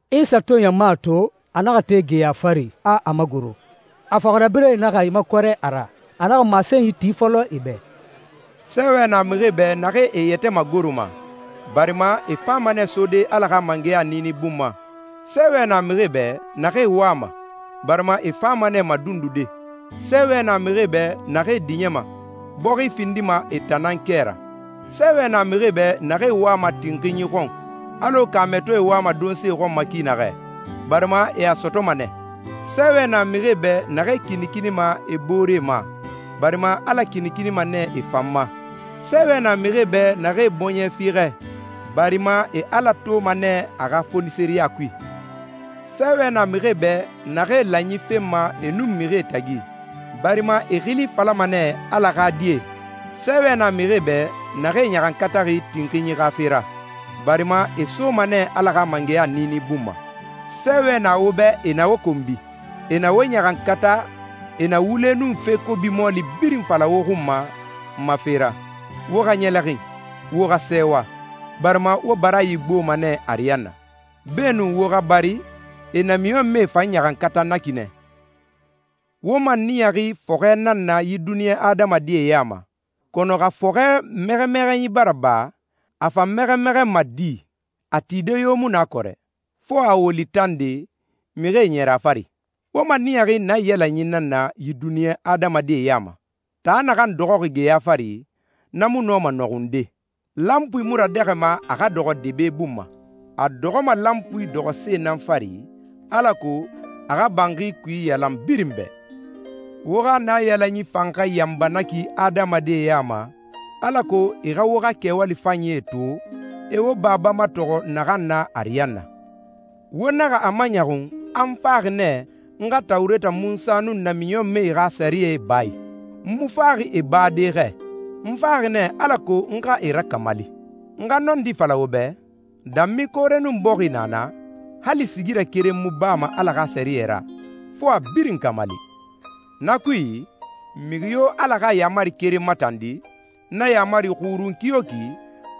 Isa to ɲama to, a naxa te geya fari, a a magoro. A fɔxirabirɛe naxa e makɔrɛ a ra. A naxa masenyi ti fɔlɔ e bɛ. «Sɛɛwɛ na mixie bɛ naxee e yɛtɛ magoroma, barima e fama nɛ sode Ala xa mangɛya niini bun ma. Sɛɛwɛ na mixie bɛ naxee wama, barima e fama nɛ madundude. Sɛɛwɛ na mixie bɛ naxee diɲɛma, bɔxi findima e tan nan kɛ ra. Sɛɛwɛ na mixie bɛ naxee wama tinxinyi xɔn, alɔ kaamɛtɔɛ wama donse xɔn ma ki naxɛ, barima e a sɔtɔma nɛ. Sɛɛwɛ na mixie bɛ naxee kinikinima e booree ma, barima Ala kinikinima nɛ e fan ma. Sɛɛwɛ na mixie bɛ naxee bɔɲɛ fiixɛ, barima e Ala toma nɛ a xa fonisireya kui. Sɛɛwɛ na mixie bɛ naxee lanyi fenma e nun mixie tagi, barima e xili falama nɛ Ala xa die. Sɛɛwɛ na mixie bɛ naxee ɲaxankataxi tinxinyi xa fe ra, barima e soma nɛ Ala xa mangɛya niini bun ma.» «Sɛɛwɛ na wo bɛ e na wo konbi, e na wo ɲaxankata, e na wule nun fe kobi mɔɔli birin fala wo xun ma n ma fe ra. Wo xa ɲɛlɛxin, wo xa sɛɛwa, barima wo baraayi gboma nɛ ariyanna. Beenun wo xa bari, e namiɲɔnmɛe fan ɲaxankata na ki nɛ.» «Wo maniyaxi fɔxɛ nan na yi duniɲa adamadie ya ma, kɔnɔ xa fɔxɛ mɛxɛmɛxɛnyi bara ba, a fa mɛxɛmɛxɛnma di? A tide yo mu na kɔrɛ, fo a woli tande, mixie ɲɛrɛ a fari. Wo maniyaxi naiyalanyi nan na yi duniɲa adamadie ya ma. Taa naxan dɔxɔxi geya fari, na mu nɔma nɔxunde. Lanpui mu radɛxɛma a xa dɔxɔ debe bun ma. A dɔxɔma lanpui dɔxɔse nan fari alako a xa banxi kui iyalan birin bɛ. Wo xa naiyalanyi fan xa yanba na ki adamadie ya ma, alako e xa wo xa kɛwali fanyie to, e wo Baba matɔxɔ naxan na ariyanna.» «Wo naxa a maɲɔxun a n faxi nɛ n xa Tawureta Munsa nun namiɲɔnmɛe xa sɛriyɛ ba a i. N mu faxi e bade xɛ, n faxi nɛ alako n xa e rakamali. N xa nɔndi fala wo bɛ, danmi koore nun bɔxi na na, hali sigirɛ keren mu bama Ala xa sɛriyɛ ra, fo a birin kamali. Na kui, mixi yo Ala xa yaamari keren matandi, na yaamari xurun kiyoki,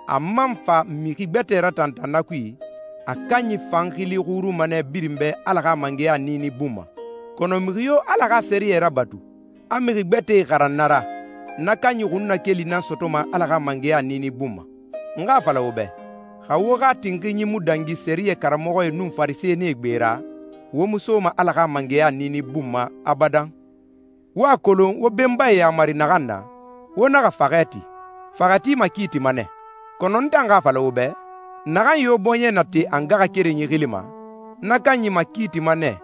a man fa mixi gbɛtɛe ratantan na kui, a kanyi fan xili xurunma nɛ birin bɛ Ala xa mangɛya niini bun ma. Kɔnɔ mixi yo Ala xa sɛriyɛ rabatu, a mixi gbɛtɛe xaran na ra, na kanyi xunnakeli nan sɔtɔma Ala xa mangɛya niini bun ma. N xa a fala wo bɛ, xa wo xa tinxinyi mu dangi sɛriyɛ karamɔxɔe nun Farisɛnie gbe ra, wo mu soma Ala xa mangɛya niini bun ma abadan.» «Wo a kolon wo benbae yamari naxan na, ‹Wo naxa faxɛ ti. Faxɛti makiitima nɛ.› Kɔnɔ n tan xa a fala wo bɛ, naxan yo bɔɲɛ na te a ngaxakerenyi xili ma, na kanyi makiitima nɛ.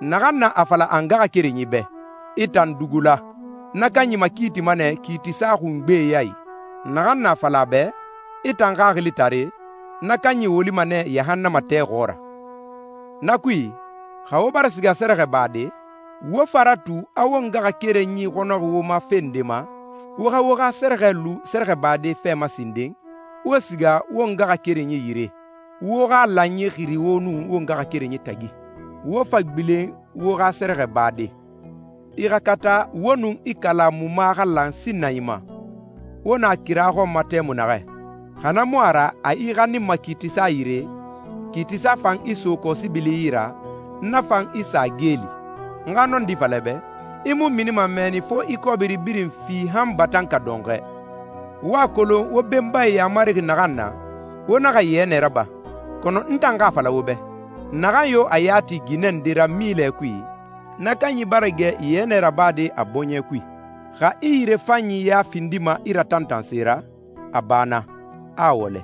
Naxan na a fala ngaxakerenyi bɛ, ‹I tan dugula›, na kanyi makiitima nɛ kiitisa xungbee ya i. Naxan na a fala a bɛ, ‹I tan xaxilitare!›, na kanyi wolima nɛ yahannama tɛ xɔɔra.» «Na kui, xa wo bara siga sɛrɛxɛ bade, wo fa ratu a wo ngaxakerenyi xɔnɔxi wo ma fe nde ma, wo xa wo xa sɛrɛxɛ lu sɛrɛxɛbade fɛ ma sinden, wo siga wo ngaxakerenyi yire. Wo xa lanyi xiri wo nun wo ngaxakerenyi tagi, wo fa gbilen wo xa sɛrɛxɛ bade.» «I xa kata wo nun i kalamuma xa lan sinnanyi ma, wo na kira xɔn ma tɛmui naxɛ. Xa na mu a ra a i xaninma kiitisa yire, kiitisa fan i so kɔsibili yi ra, na fan i sa geeli. N xa nɔndi fala i bɛ, i mu minima mɛnni fo i kɔbiri birin fi han batanka dɔnxɔɛ.» «Wo a kolon wo benbae yamari naxan na, ‹Wo naxa yɛnɛ raba.› Kɔnɔ n tan xa a fala wo bɛ, naxan yo a ya ti ginɛ nde ra milɛ kui, na kanyi bara gɛ yɛnɛ rabade a bɔɲɛ kui. Xa i yirefan ya findima i ratantanse ra, a ba na, a wɔlɛ.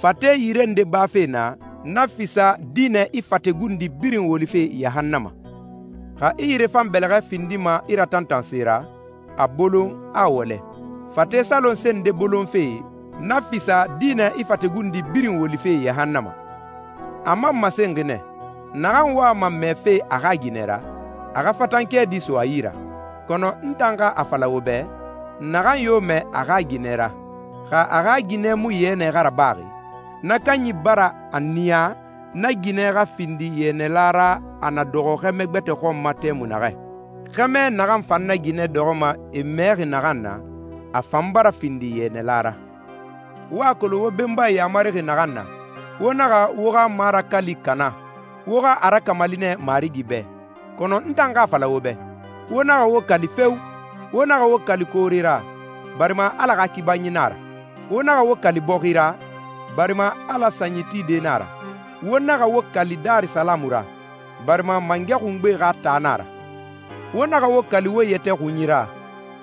Fate yire nde bafe na, na fisa dinɛ i fate gundi birin wolife yahannama. Xa i yirefan bɛlɛxɛ findima i ratantanse ra, a bolon, a wɔlɛ. Fate salonse nde bolonfe, na fisa dinɛ i fate gundi birin wolife yahannama.» «A man masenxi nɛ, ‹Naxan wama mɛɛfe a xa ginɛ ra, a xa fatan kɛɛdi so a yi ra.› Kɔnɔ n tan xa a fala wo bɛ, naxan yo mɛɛ a xa ginɛ ra, xa a xa ginɛ mu yɛnɛ xa rabaxi, na kanyi bara a niya na ginɛ xa findi yɛnɛla ra a na dɔxɔ xɛmɛ gbɛtɛ xɔn ma tɛmui naxɛ. Xɛmɛ naxan fan na ginɛ dɔxɔma e mɛɛxi naxan na, a fan bara findi yɛnɛla ra.» «Wo a kolon wo benbae yamari naxan na, ‹Wo naxa wo xa marakali kana, wo xa a rakamali nɛ Marigi bɛ.› Kɔnɔ n tan xa a fala wo bɛ, wo naxa wo kali feo! Wo naxa wo kali koore ra, barima Ala xa kibanyi nan a ra. Wo naxa wo kali bɔxi ra, barima Ala sanyi tide na a ra. Wo naxa wo kali Darisalamu ra, barima Mangɛ Xungbe xa taa nan a ra. Wo naxa wo kali wo yɛtɛ xunyi ra,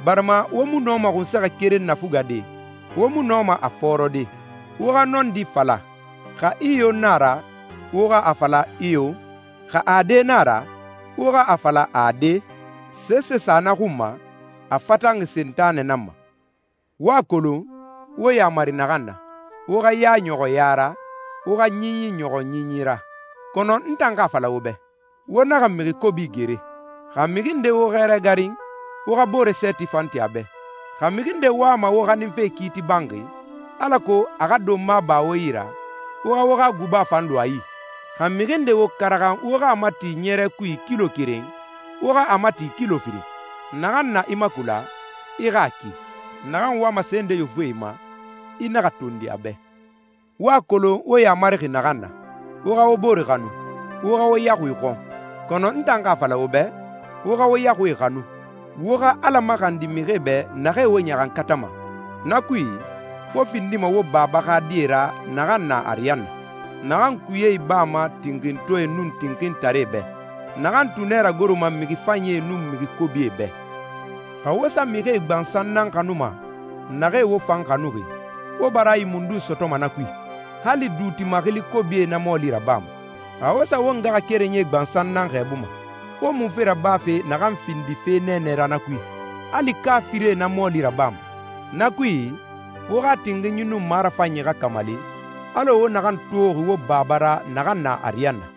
barima wo mu nɔma xunsɛxɛ keren nafugade, wo mu nɔma a fɔɔrɔde. Wo xa nɔndi fala. Xa iyo nan a ra, wo xa a fala ‹iyo›. Xa ade nan a ra, wo xa a fala ‹ade›. Sese sa na xun ma, a fatanxi Sentanɛ nan ma.» «Wo a kolon wo yamari naxan na, ‹Wo xa ya ɲɔxɔ ya ra, wo xa ɲinyi ɲɔxɔ ɲinyi ra.› Kɔnɔ n tan xa a fala wo bɛ, wo naxa mixi kobi gere. Xa mixi nde wo xɛrɛ garin, wo xa boore sɛɛti fan ti a bɛ. Xa mixi nde wama wo xaninfe kiiti banxi, alako a xa donma ba wo yi ra, wo xa wo xa guba fan lu a yi. Xa mixi nde wo karaxan wo xa a mati ɲɛrɛ kui kilo keren, wo xa a mati kilo firin. Naxan na i makula, i xa a ki. Naxan wama se nde yofufe i ma, i naxa tondi a bɛ.» «Wo a kolon wo yamarixi naxan na, ‹Wo xa wo boore xanu, wo xa wo yaxui xɔn.› Kɔnɔ n tan xa a fala wo bɛ, wo xa wo yaxuie xanu, wo xa Ala maxandi mixie bɛ naxee wo ɲaxankatama. Na kui, wo findima wo Baba xa die ra naxan na ariyanna, naxan kuye ibama tinxintɔɛe nun tinxintaree bɛ, naxan tunɛ ragoroma mixi fanyie nun mixi kobie bɛ. Xa wo sa mixie gbansan nan xanuma, naxee wo fan xanuxi, wo baraayi mundun sɔtɔma na kui? Hali duuti maxili kobie na mɔɔli rabama. Xa wo sa wo ngaxakerenyie gbansan nan xɛɛbuma, wo munfe rabafe naxan findi fe nɛɛnɛ ra na kui? Hali kaafirie na mɔɔli rabama. Na kui, wo xa tinxinyi nun marafanyi xa kamali, alɔ wo naxan toxi wo Baba ra naxan na ariyanna.»